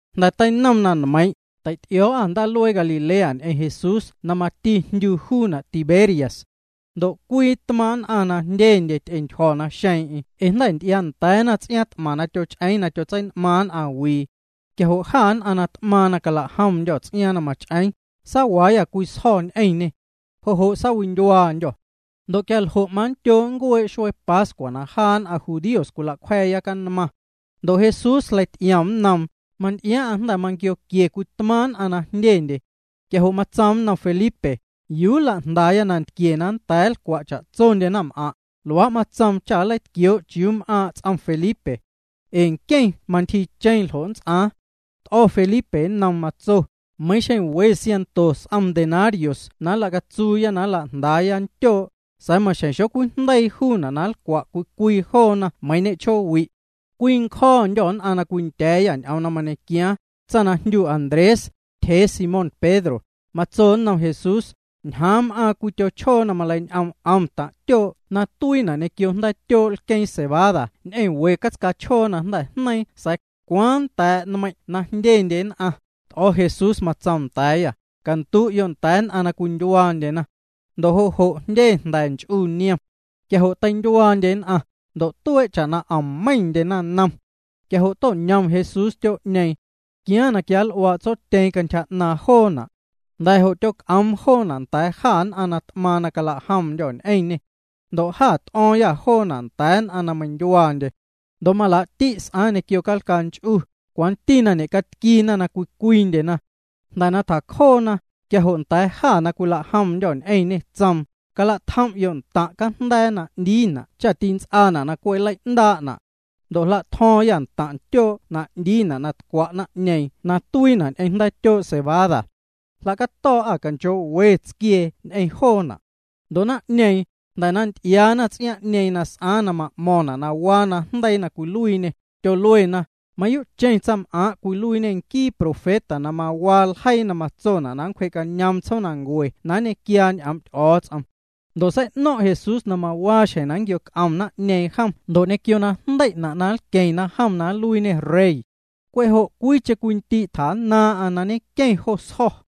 Jnda̱ teinom na nmeiiⁿ', teity'io̱o̱'â ndaaluee Galilea ñ'eⁿ Jesús na mati jndyu juuna' Tiberias. Ndo' cwii tmaaⁿ' nn'aⁿ na jndyendye ty'entyjo̱na naxeeⁿ'eⁿ ee jnda̱ nty'iaanda̱a̱na ts'iaaⁿ t'maⁿ na tyoch'eeⁿ na tyotsein'maaⁿ nn'aⁿwii. Quia jo' jâ nn'aⁿ na t'maaⁿ na cala'jomndyô̱ ts'iaaⁿ na mach'eeⁿ, saawaayâ cwii sjo̱ ñ'eⁿñê. Jo' jo' saawindyuaandyô̱. Ndo' quia ljo' manndyoo' nncuee' xuee pascua na jaa nn'aⁿ judíos cwilacwja̱a̱ya canmaⁿ. Ndo' Jesús jleity'iom nnoom, manty'iaaⁿ'aⁿ jnda̱ manquioquie cwii tmaaⁿ' nn'aⁿ na jndyendye. Quia jo' matsoom nnom Felipe: —¿Yuu nla'jndaaya nantquie cha nnda̱a̱ nlcwa' cha'tsondye naⁿm'aⁿ'? Luaa' matsoom cha nleitquioo' chiuu m'aaⁿ' ts'om Felipe. Ee nqueⁿ mantyjiicheeⁿ ljo' nnts'aaⁿ. T'o̱ Felipe nnoom, matso: —Meiⁿ xeⁿ we siaⁿnto s'om denarios na nlacatsuuya na nla'jndaaya ntyoo', sa̱a̱ maxjeⁿ xocwijndeii juuna' na nlcwa' cwii cwii joona meiiⁿ ñe'chjoowi'. Cwii ncjo̱o̱ndyô̱ nn'aⁿ na cwindya̱a̱yâ ñ'oom na mañequiaaⁿ, tsaⁿ na jndyu Andrés, tyjee Simón Pedro, matso nnom Jesús: —Ñjaaⁿ m'aaⁿ cwii tyochjoo na maleiñ'oom 'om taⁿ' tyoo' na tuiina' ñequio jnda̱a̱tyoo' lqueeⁿ cebada ñ'eⁿ we catscaa chjoo na jnda̱ jneiiⁿ sa̱a̱ ¿cwaaⁿ nnda̱a̱' nmeiⁿ' na jndyendye nn'aⁿ? T'o̱ Jesús, matsoom nda̱a̱yâ: —Candu'yo' nda̱a̱ nn'aⁿ na cwindyuaandyena. Ndo' jo' jo' jndye jnda̱ nch'u niom. Quia jo' teindyuaandye nn'aⁿ, ndo' tuee' cha'na 'om meiⁿndye naⁿnom. Quia jo' to'ñom Jesús ntyoo'ñeeⁿ. Tquiaaⁿ na quianl'uaa' Tsotyeeⁿ cantyja 'naaⁿ joona'. Jnda̱ jo' tyoc'oom joona' nda̱a̱ jâ nn'aⁿ na t'maaⁿ na cala'jomndyô̱ ñ'eⁿñê. Ndo' jâ t'o̱o̱ⁿyâ joona' nda̱a̱ nn'aⁿ na meindyuaandye. Ndo' malaa'ti' s'aaⁿ ñequio calcaa nch'u, cwanti na ñe'catquiina na cwii cwiindyena. Jnda̱ na tjacjoona, quia jo' nda̱a̱ jâ na cwila'jomndyô̱ ñ'eⁿñê tsoom: —Cala'tjom'yo' ntaⁿ' cajnda̱a̱ na 'ndiina' cha tints'aana' na cwe' nlei'ndaa'na'. Ndo' jlatjo̱o̱ⁿyâ ntaⁿ' ntyoo' na 'ndiina' na tcwa' naⁿ'ñeeⁿ na tuiina' ñ'eⁿ jnda̱a̱tyoo' cebada. Jla'cato̱o̱'â canchoo'we tsquiee ñ'eⁿ joona'. Ndo' naⁿ'ñeeⁿ, jnda̱ na nty'iaana ts'iaaⁿ'ñeeⁿ na s'aaⁿ na ma'mo̱ⁿna' na waa najndeii na cwiluiiñê, tyoluena: —Mayuu'cheⁿ tsaⁿs'am'aaⁿ' cwiluiiñê nquii profeta na mawaa ljeii na matsona' na nncwje'cañoom tsjoomnancue na nñequiaa ñ'oom' Ty'o̱o̱ts'om. Ndo' sei'no̱ⁿ' Jesús na mawaa xjeⁿ na nnquioc'om naⁿ'ñeeⁿ jom ndo' ñequio najndei'na' na nlqueⁿna jom na nluiiñê rey. Cwe' jo' cwiicheⁿ cwii ndii' tjannaaⁿ'aⁿ na ñenqueⁿ jo sjo̱.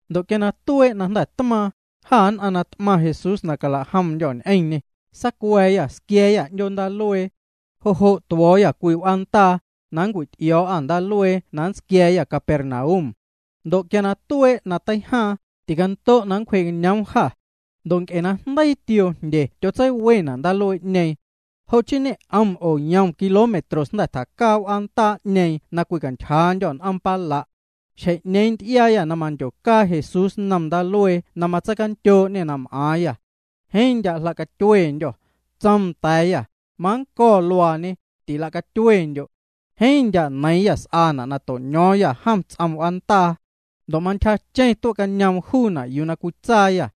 Ndo' quia na tuee' na jnda̱ tmaaⁿ, jâ nn'aⁿ na t'maⁿ Jesús na cala'jomndyô̱ ñ'eⁿñê, saacua̱a̱yâ, squia̱a̱yâ 'ndyoo ndaaluee. Jo' jo' tuo̱o̱yâ cwii w'aandaa, na nncwity'io̱o̱'â ndaaluee na nntsquia̱a̱yâ Capernaum. Ndo' quia tuee' na teijaaⁿ, ticando' na nncwje'cañoom jâ. Ndo' nc'e na jndeii tioo jndye tyotseiwena' ndaaluee'ñeeⁿ. Jo' chii ñe'om oo yom kilómetros jnda̱ tjacaa w'aandaa'ñeeⁿ na cwicantyjaandyô̱ n'oom pala'. Xjeⁿ'ñeeⁿ nty'iaayâ na mandyocaa Jesús nnom ndaaluee na matseicandyoo'ñê na m'aaⁿyâ. Jeeⁿ ndya' jla'catyuendyô̱. Tsoom nda̱a̱yâ: —Mannco̱ luaañe, tilacatyuendyo'. Jeeⁿ ndya' neiiⁿyâ s'aana' na to'ño̱o̱ⁿyâ jom ts'om w'aandaa. Ndo' mantyjacheⁿ tue'cañoom juuna' yuu na cwitsaayâ.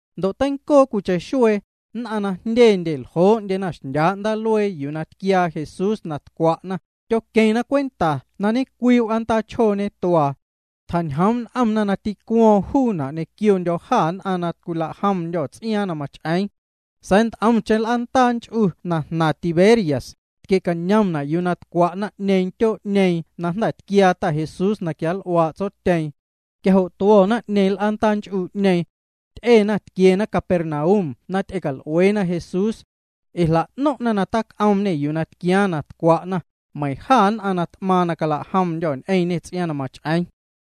Ndo' teincoo cwiicheⁿ xuee, nn'aⁿ na jndyendye na ljoo'ndye xndyaa' ndaaluee yuu na tquiaa Jesús na tcwa'na, tyoqueⁿna cwenta na ñe'cwii w'aandaa chjoo ñetuaa. Tjañjoom' n'omna na tîcuo̱o̱ⁿ juuna' ñequiondyô̱ jâ nn'aⁿ na cwila'jomndyô̱ ts'iaaⁿ na mach'eeⁿ. Sa̱a̱ nt'omcheⁿ l'aandaa nch'u na jnaⁿ Tiberias, tquie'cañomna' yuu na tcwa' naⁿ'ñeeⁿ ntyoo'ñeeⁿ na jnda̱ tquiaa Ta Jesús na quianl'uaa' Tsotyeeⁿ. Quia jo' tuo̱ naⁿ'ñeeⁿ l'aandaa nch'u'ñeeⁿ. Ty'ena tquiena Capernaum na ty'ecal'ueena Jesús. Ee jla'no̱ⁿ'na na tac'oomñê yuu na tquiaaⁿ na tcwa'na, meiⁿ jâ nn'aⁿ na t'maaⁿ na cala'jomndyô̱ ñ'eⁿñê ts'iaaⁿ na mach'eeⁿ.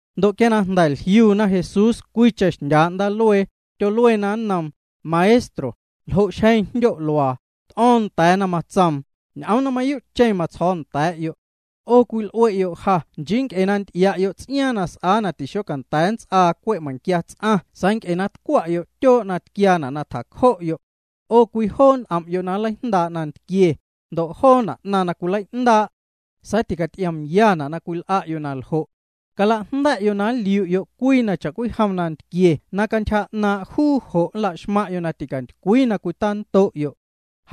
Ndo' quia na jnda̱ jliuna Jesús cwiicheⁿ xndyaa' ndaaluee, tyoluena nnoom: —Maestro, ¿ljo' xjeⁿ jndyo' luaa? T'o̱o̱ⁿ nda̱a̱na, matsoom: —Ñ'oom na mayuu'cheⁿ na matsjo̱o̱ nda̱a̱'yo'. 'O cwil'ue'ya'yo' ja nchii nc'e na nty'ia'yo' ts'iaaⁿ na s'aa na tixocanda̱a̱ nts'aa cwe' meiⁿquia ts'aⁿ sa̱a̱ cwe' nc'e na tcwa'yo' tyoo' na tquiaana' na tjacjo'yo'. 'O cwijoo' n'om'yo' na nleijndaa' nantquie, ndo' joona' 'naⁿ na cwilei'ndaa'. Sa̱a̱ ticaty'iomna' na cwil'a'yo' na ljo'. Calajnda̱'yo' na nliu'yo' cwii na cha'cwijom nantquie na cantyja 'naaⁿ' juu jo' nla'xmaⁿ'yo' na ticantycwii na cwitando'yo'.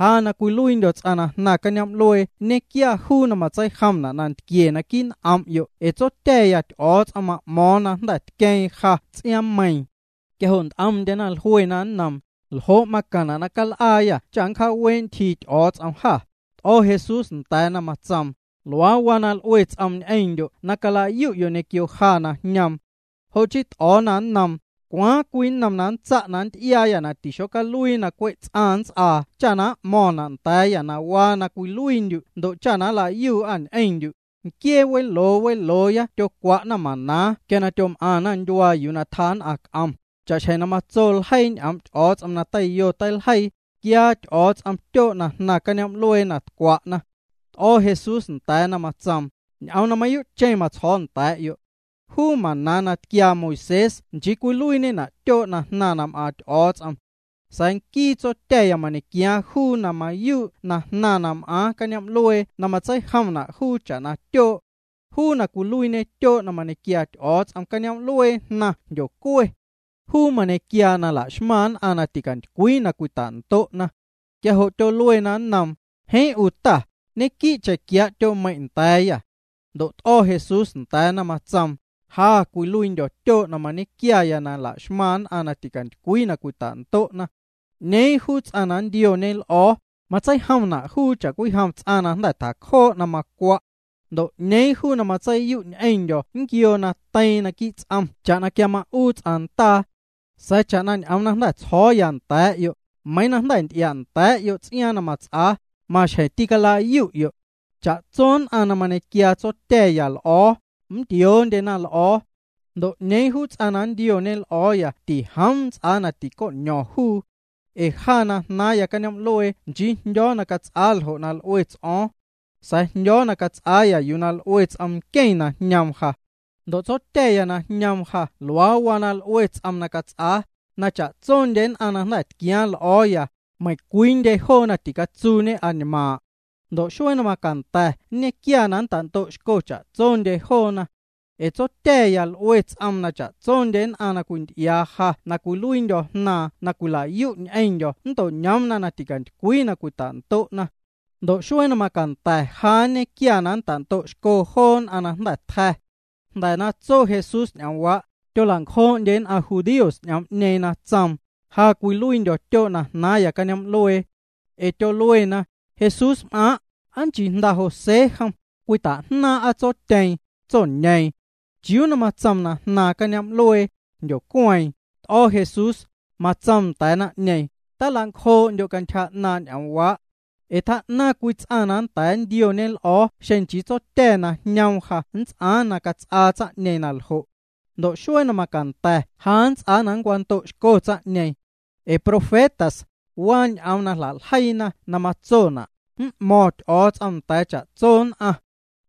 Ja na cwiluiindyo̱ ts'aⁿ na jnaⁿ cañoom'luee nñequia juu na matseijomna' nantquie naquii' n'om'yo' ee Tsotya̱ya Ty'o̱o̱ts'om ma'mo̱o̱ⁿ na jnda̱ tqueeⁿ ja ts'iaaⁿmeiiⁿ. Quia jo' nt'omndyena jluena nnoom: —¿Ljo' macaⁿna' na cal'aayâ cha na nncjaawee' ntyjii Ty'o̱o̱ts'om jâ? T'o̱ Jesús nda̱a̱na, matsoom: —Luaa waa na l'ue ts'oom ñ'eⁿndyo' na cala'yu'yo' ñequio ja na jñoom. Jo' chii t'o̱o̱na nnoom: —¿Cwaaⁿ cwii nnom na nntsa' nnty'iaayâ na tixocaluii na cwe' ts'aⁿ nnts'aa cha m'mo̱ⁿna' nda̱a̱yâ na waa na cwiluiindyu' ndo' cha na nla'yuu'â ñ'eⁿndyu'? Nquiee weloo welooya tyocwa'na maná quia tyom'aⁿna ndyuaa yuu na tjaa nn'aⁿ c'om, cha'xjeⁿ na matso ljeii ñ'oom' Ty'o̱o̱ts'om na teiyo teiljeii: “Tquiaa Ty'o̱o̱ts'om tyoo' na jnaⁿ cañoom'luee na tcwa'na.” T'o̱ Jesús nda̱a̱na, matsoom: —Ñ'oom na mayuu'cheⁿ matsjo̱o̱ nda̱a̱'yo'. Juu maná na tquiaa Moisés nchii cwiluiiñena' tyoo' na jnaⁿ na m'aaⁿ Ty'o̱o̱ts'om. Sa̱a̱ nquii Tsotya̱ya mañequiaaⁿ juu na mayuu' na jnaⁿ na m'aaⁿ cañoom'luee na matseijomna' juu cha'na tyoo'. Juu na cwiluiiñe tyoo' na mañequiaa Ty'o̱o̱ts'om, cañoom'luee jnaⁿ jndyocue. Juu mañequiaa na la'xmaⁿ nn'aⁿ na ticantycwii na cwita'ndo'na. Quia jo' tyoluena nnoom: —Jeeⁿ 'u Ta, ñenquii'cheⁿ quiaa' tyoo'meiⁿ' nda̱a̱yâ. Ndo' t'o̱ Jesús nda̱a̱na, matsoom: —Ja cwiluiindyo̱ tyoo' na mañequiaya na la'xmaⁿ nn'aⁿ na ticantycwii na cwita'ndo'na. 'Ñeeⁿ juu ts'aⁿ na nntioñe l'o̱o̱, matseijomna' juu cha'cwijom ts'aⁿ na jnda̱ tjacjoo' na macwa'. Ndo' 'ñeeⁿ ts'aⁿ na matseiyu' ñ'eⁿndyo̱ nquioo na teiiⁿ naquii' ts'om cha'na quia ma'uu ts'aⁿ ndaa. Sa̱a̱ cha'na ñ'oom na jnda̱ tsjo̱o̱ya nda̱a̱'yo', meiiⁿ na jnda̱ nty'ia'nda̱a̱'yo' ts'iaaⁿ na mats'aa, maxjeⁿ tîcala'yu'yo'. Cha'tso nn'aⁿ na mañequiaa Tsotya̱ya l'o̱o̱, nntioondyena l'o̱o̱. Ndo' 'ñeeⁿ juu ts'aⁿ na nntioñe l'o̱o̱ya tijoom nnts'aa na tico'ño̱ⁿ juu. Ee ja na jnaaⁿya caáoom'luee nchii na jndyo̱o̱ na cats'aa ljo' na l'ue ts'o̱o̱ⁿ. Sa̱a̱ jndyo̱o̱ na cats'aaya yuu na l'ue ts'om nqueⁿ na jñoom ja. Ndo' Tsotya̱ya na jñoom ja luaa waa na l'ue ts'oom na cats'aa, na cha'tsondye nn'aⁿ na jnda̱ tquiaaⁿ l'o̱o̱ya, meiⁿcwiindye joona ticatsuuñe añmaaⁿ'. Ndo' xuee na macanda̱ nñequia na nnta'ndo'xco cha'tsondye joona. Ee Tsotya̱ya l'ue ts'oom na cha'tsondye nn'aⁿ na cwinty'iaa ja na cwiluiindyo̱ Jnaaⁿ na cwila'yu' ñ'eⁿndyo̱ nnto'ñoomna na ticantycwii na cwita'ndo'na. Ndo' xuee na macanda̱ ja nñequia na nnta'ndo'xco joo nn'aⁿ na jnda̱ tja̱. Jnda̱ na tso Jesús ñ'oomwaa', tyola'ncjoo'ndye nn'aⁿ judíos'ñeeⁿ ñ'oom na tsoom: “Ja cwiluiindyo̱ tyoo' na jnaaⁿya cañoom'luee.” Ee tyoluena: —Jesúsm'aaⁿ' ¿aa nchii jnda José jom? Cwita'jnaaⁿ'a tsotyeeⁿ, tsoñeeⁿ. ¿Chiuu na tsoom na jnaaⁿ cañoom'luee, jndyocueeⁿ? T'o̱ Jesús, matsoom nda̱a̱ naⁿ'ñeeⁿ: —Tala'ncjoo'ndyo' cantyja 'naaⁿ' ñ'oomwaa'. Ee tjaa'naⁿ cwii ts'aⁿ na nnda̱a̱ nntioñe l'o̱o̱ xeⁿ nchii Tsotya̱ na jñoom ja nnts'aaⁿ na cats'aa tsaⁿ'ñeeⁿ na ljo'. Ndo' xuee na macanda̱ ja nnts'aa na nncwando'xco tsaⁿ'ñeeⁿ. Ee profetas, waa ñ'oom na jla'ljeiina na matsona': “M'mo̱ⁿ Ty'o̱o̱ts'om nda̱a̱ cha'tso nn'aⁿ.”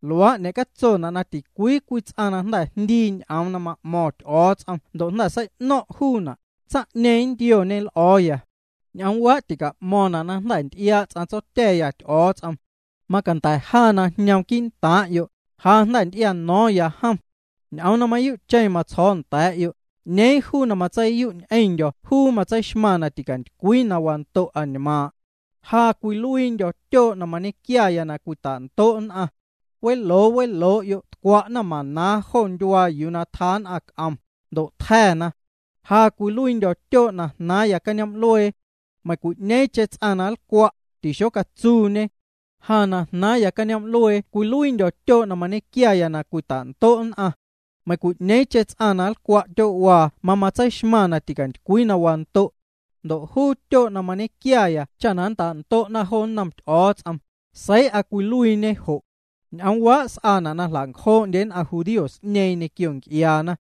Luaa' ñe'catsona' na ticwii cwii ts'aⁿ na jnda̱ jndii ñ'oom na ma'mo̱ⁿ Ty'o̱o̱ts'om ndo' jnda̱ sei'no̱ⁿ' juuna', tsaⁿ'ñeeⁿ nntioñe l'o̱o̱ya. ’Ñ'oomwaa' tica'mo̱ⁿna' na jnda̱ nty'iaa' ts'aⁿ Tsotya̱ya Ty'o̱o̱ts'om. Macanda̱ ja na jñoom quii'ntaaⁿ'yo', ja jnda̱ nty'iano̱o̱ⁿya jom. Ñ'oom na mayuu'cheⁿ matsjo̱o̱ nda̱a̱'yo', ñeeⁿ juu na matseiyu' ñ'eⁿndyo̱ juu matseixmaⁿ na ticantycwii na wando' añmaaⁿ'. Ja cwiluiindyo̱ tyoo' na mañequiaya na cwita'ndo' nn'aⁿ. Weloo weloo'yo' tcwa'na maná jo ndyuaa yuu na tjaa nn'aⁿ c'om, ndo' tja̱na. Ja cwiluiindyo̱ tyoo' na jnaaⁿya cañoom'luee. Meiⁿcwi'ñeeⁿcheⁿ ts'aⁿ na nlcwa', tixocatsuuñe. Ja na jnaaⁿya cañoom'luee cwiluiindyo̱ tyoo' na mañequiaya na cwita'ndo' nn'aⁿ. Meiⁿcwi'ñeeⁿcheⁿ ts'aⁿ na nlcwa' tyoo'waa mamatseixmaⁿ na ticantycwii na wando'. Ndo' juu tyoo' na mañequiaya cha na nnta'ndo'na jo nnom Ty'o̱o̱ts'om, seii'a cwiluiiñe Jo'. Ñ'oomwaa' s'aana' na jla'ncjoo'ndye nn'aⁿ judíos'ñeeⁿ ñequio nc'iaana.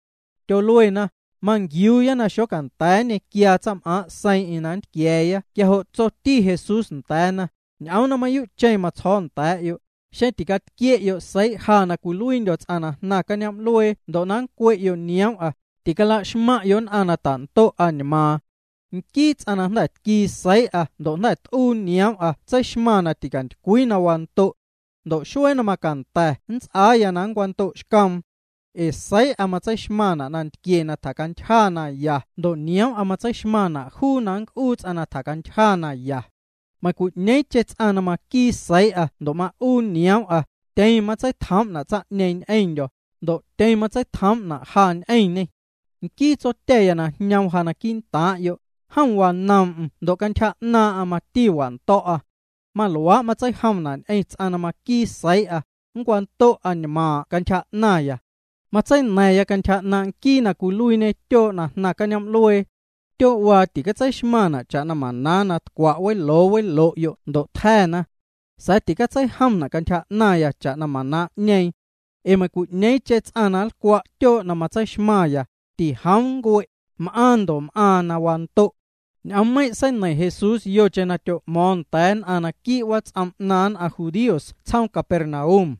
Tyoluena: —Manquiuuya na xocanda̱a̱ nñequiaa tsaⁿm'aaⁿ' seiiⁿ'eⁿ na nntquia̱a̱ Quia jo' tsoticheⁿ Jesús nda̱a̱na: —Ñ'oom na mayuu'cheⁿ matsjo̱o̱ nda̱a̱'yo', xeⁿ ticatquie'yo' seii' ja na cwiluiindyo̱ ts'aⁿ na jnaⁿ cañoom'luee ndo' na cwe'yo' nioom'a, ticala'xmaⁿ'yo' nn'aⁿ na tando' añmaaⁿ. Nquii ts'aⁿ na jnda̱ tquii seii'a ndo' jnda̱ t'uu nioom'a tseixmaⁿ na ticantycwii na wando'. Ndo' xuee na macanda̱ nnts'aaya na nncwando'xcoom. Ee seii'a matseixmaⁿna' nantquie na tjacantyja naya ndo' nioom'a matseixmaⁿna' juu na nnc'uu ts'aⁿ na tjacantyja naya. Meiⁿcwi'ñeeⁿcheⁿ ts'aⁿ na maquii seii'a ndo' ma'uu nioom'a, tyeⁿ matseitjoom'na' tsaⁿ'ñeeⁿ ñ'eⁿndyo̱, ndo' tyeⁿ matseitjoom'na' ja ñ'eⁿñê. Nquii Tsotya̱ya na jñoom ja quii'ntaaⁿ'yo', jom wanoom'm ndo' cantyja 'naaⁿ'aⁿ mati wando̱'a. Maluaa' matseijomna' ñ'eⁿ ts'aⁿ na maquii seii'a, nncwando' añmaaⁿ' cantyja 'naⁿya. Matseina̱ⁿya cantyja 'naaⁿ' nquii na cwiluiiñe tyoo' na jnaⁿ cañoom'luee. Tyoo'waa titseixmaⁿna' cha'na maná na tcwa' weloo welo'yo' ndo' tja̱na. Sa̱a̱ ticatseijomna' cantyja 'naⁿya cha'na maná'ñeeⁿ. Ee meiⁿcwi'ñeeⁿcheⁿ ts'aⁿ na nlcwa' tyoo' na matseixmaⁿya, tijoom nncue', m'aaⁿ ndo' m'aaⁿ na wando'. Ñ'oommeiⁿ' seineiⁿ Jesús yocheⁿ na tyo'mo̱o̱ⁿ nda̱a̱ nn'aⁿ quii' wats'om 'naaⁿ nn'aⁿ judíos tsjoom Capernaum.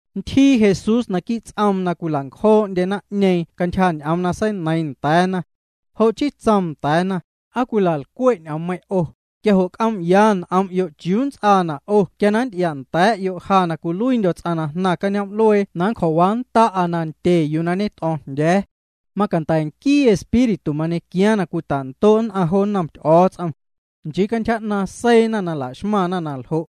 Ntyjii Jesús naquii' ts'oom na cwila'ncjoo'ndye naⁿ'ñeeⁿ cantyja ñ'oom na seineiiⁿ nda̱a̱na. Jo' chii tsoom nda̱a̱na: —¿Aa cwila'lcwe' ñ'oommeiⁿ' 'o? Quia jo' c'oom'yaya n'om'yo' chiuu nnts'aana' 'o quia nnty'ia'nda̱a̱'yo' ja na cwiluiindyo̱ ts'aⁿ na jnaⁿ cañoom'luee na nncjo̱waannda'a nandye yuu na ñet'o̱o̱ⁿjndya̱a̱. Macanda̱ nquii Espíritu mañequiaaⁿ na cwita'ndo' nn'aⁿ jo nnom Ty'o̱o̱ts'om. Nchii cantyja 'naaⁿ seiina na la'xmaⁿna na ljo'.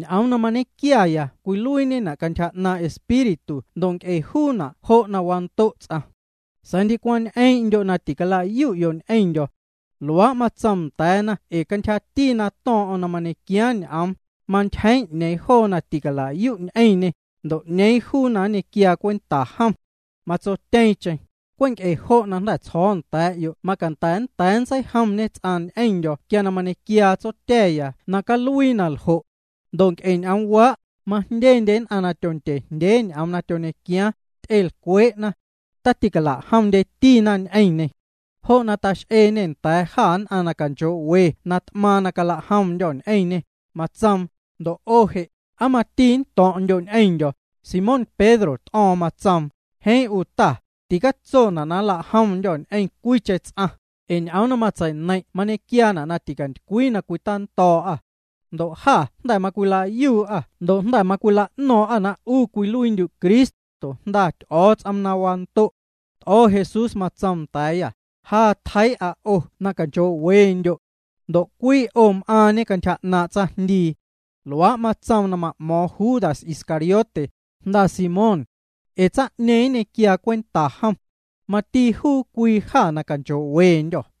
Ñ'oom na mañequiaya cwiluiiñena' cantyja 'naaⁿ' Espíritu ndo' nc'e juuna' jo' na wando' ts'aⁿ. Sa̱a̱ ndicwaⁿ ñ'eeⁿ'ndyo' na ticalayu'yo' ñ'eⁿndyo̱. Luaa' matsoom nda̱a̱na ee cantyjati na to̱o̱ⁿ'o̱ⁿ na mañequiaaⁿ ñ'oom, mantyjeeⁿ 'ñeeⁿ joo na ticala'yu' ñ'eⁿñê, ndo' 'ñeeⁿ juu na nñequiaa cwenta jom. Matsotyeeⁿcheⁿ: —Cwe' nc'e jo' na jnda̱ tsjo̱o̱ nda̱a̱'yo' macanda̱ nnda̱a̱ ntseijomñe ts'aⁿ ñ'eⁿndyo̱ quia mañequiaa Tsotya̱ya na caluii na ljo'. Ndo' nc'e ñ'oomwaa', majndye nn'aⁿ na tyondyejndyeena ñ'oom na tyoñequiaaⁿ, ty'elcwee'na. Taticala'jomndyetina ñ'eⁿñê. Jo' na tax'eeñê nda̱a̱ jâ nn'aⁿ na canchoo'we na t'maaⁿ na cala'jomndyô̱ ñ'eⁿñê, matsoom: —Ndo' 'o je' ¿aa mati nnto̱ⁿ'ndyo' ñ'eⁿndyo̱? Simón Pedro t'o̱o̱ⁿ, matsoom: —Jeeⁿ 'u Ta, ticatsona' na nla'jomndyô̱ ñ'eⁿ cwiicheⁿ ts'aⁿ, ee ñ'oom na matseineiⁿ' mañequiaana' na ticantycwii na cwitando̱o̱'â. Ndo' jâ jnda̱ macwila'yuu'â ndo' jnda̱ macwila'no̱o̱ⁿ'â na 'u cwiluiindyu' Cristo, Jnda Ty'o̱o̱ts'om na wando'. T'o̱ Jesús, matsoom nda̱a̱yâ: —Ja tjeii'a 'o na canchoo'wendyo'. Ndo' cwii 'o m'aaⁿñe cantyja 'naaⁿ' tsaⁿjndii. Luaa' matsoom na ma'mo̱o̱ⁿ Judas Iscariote, jnda Simón. Ee tsaⁿ'ñeeⁿ nñequiaa cwenta jom. Mati juu cwii jâ na canchoo'wendyô̱.